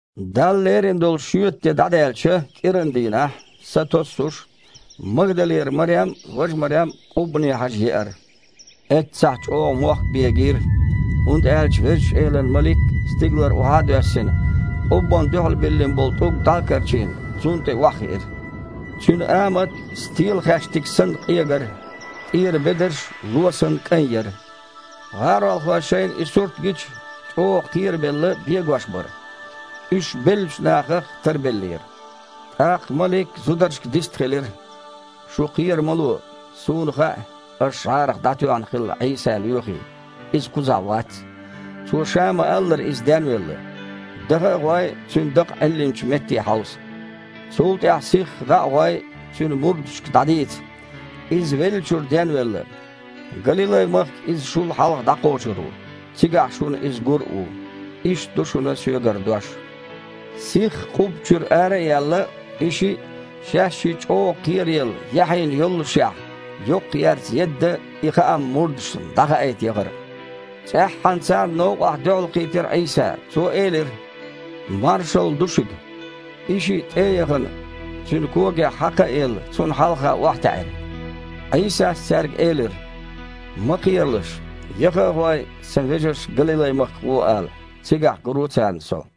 Далла лерина долу шоьтан де дІадаьлча, кІирандийнахь, сатоссуш, Магдалера Марем а, важа Марем а къуббане хьажа еара. Эццахь чІогІа мохк бегийра, хІунда аьлча Везачу Элан малик, стигалара охьа а доьссина, къуббанна дуьхьал биллина болу тІулг дІа а карчийна, цунна тІе охьахиира. Цуьнан амат, стелахаьштиг санна, къегара, тІера бедарш, ло санна, кІайн яра. ГІаролхой шайна и сурт гича, чІогІа кхерабелла, бегош бара. Уьш беллачу нахах тарбеллера. ТІаккха малик зударшка дистхилира: «Шу кхера ма ло. Суна хаьа, аша жІарах дІатоьхна хилла Іийса лоьхий. Иза кхузахь вац. Цо Ша ма-аллара, Иза денвелла. Даха а гІой, Цуьнан дакъа Іиллинчу метте хьовса. Цул тІаьхьа, сихха дІа а гІой, Цуьнан мурдашка дІадийца: „Иза веллачуьра денвелла. Галилай-махка Иза шул хьалха дІакхочур ву. Цигахь шуна Иза гур а ву“. Иштта ду шуна соьгара дош». Сихха къубба чуьра ара а яьлла, и шиъ, шаьшшиъ чІогІа кхераелла, яхьийна йоллушехь, йоккхаерца едда и хаам мурдашна дІахаийта яхара. ЦІеххьана царна новкъахь дуьхьалкхийтира Іийса. Цо элира: «Маршалла ду шуьга». И шиъ, тІе а яхана, Цуьнан когех хьакха а елла, Цунна хьалха охьатаьІира. Іийсас цаьрга элира: «Ма кхералаш. Яха а гІой, Сан вежаршка Галилай-махка гІо ала. Цигахь гур ву царна Со».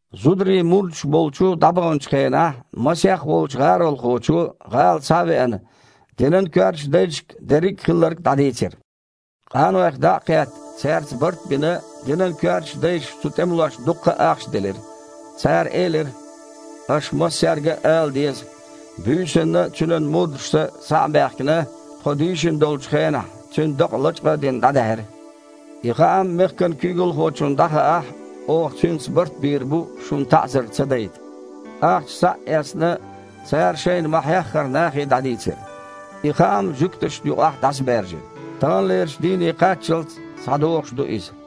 Зударий мурдаш болчу дІабаханчу хенахь, масех волчу гІаролхочо, гІала схьа а веана, динан коьртачу дайшка дерриг а хилларг дІадийцира. Къанойх дІа а кхетта, цаьрца барт а бина, динан коьртачу дайша цу тІемалошна дуккха а ахча делира. Цара элира: «Аша массаьрга а ала деза: „Буьйсанна Цуьнан мурдаша, схьа а баьхкина, тхо дийшина долчу хенахь, Цуьнан дакъа, лачкъа а дина, дІадаьхьира“. И хаам мехкан куьйгалхочунна дІахаахь, оха цуьнца барт бийр бу шуна таІзар ца дайта». Ахча схьа а эцна, цара, шайна ма-хьеххара, нахе дІадийцира. И хаам жуьгташна юкъахь дІасабаьржира. Таханлерчу дийне кхаччалц схьадогІуш а ду иза.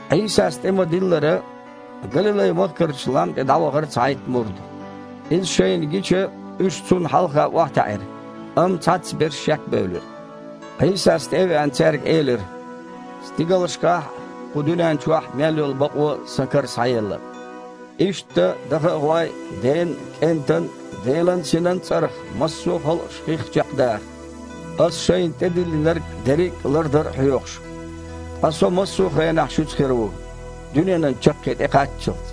Іийсас тІе ма-диллара, Галилай-махкарчу лам тІе дІавахара цхьайтта мурд. Иза шайна гича, уьш Цунна хьалха охьатаьІира, амма цхьаццаберш шекбевлира. Іийсас, тІе а веана, цаьрга элира: «Стигалшкахь а, кху дуьнен чохь а мел йолу бакъо Сан кара схьаелла. Иштта, даха а гІой, Ден, КІентан, Делан Синан цІарах массо а халкъаш хих чекхдаха, Аса шайна тІедиллинарг дерриг а лардар а хьоьхуш. Ткъа Со массо а хенахь шуьца хир ву, дуьненан чаккхе тІекхаччалц».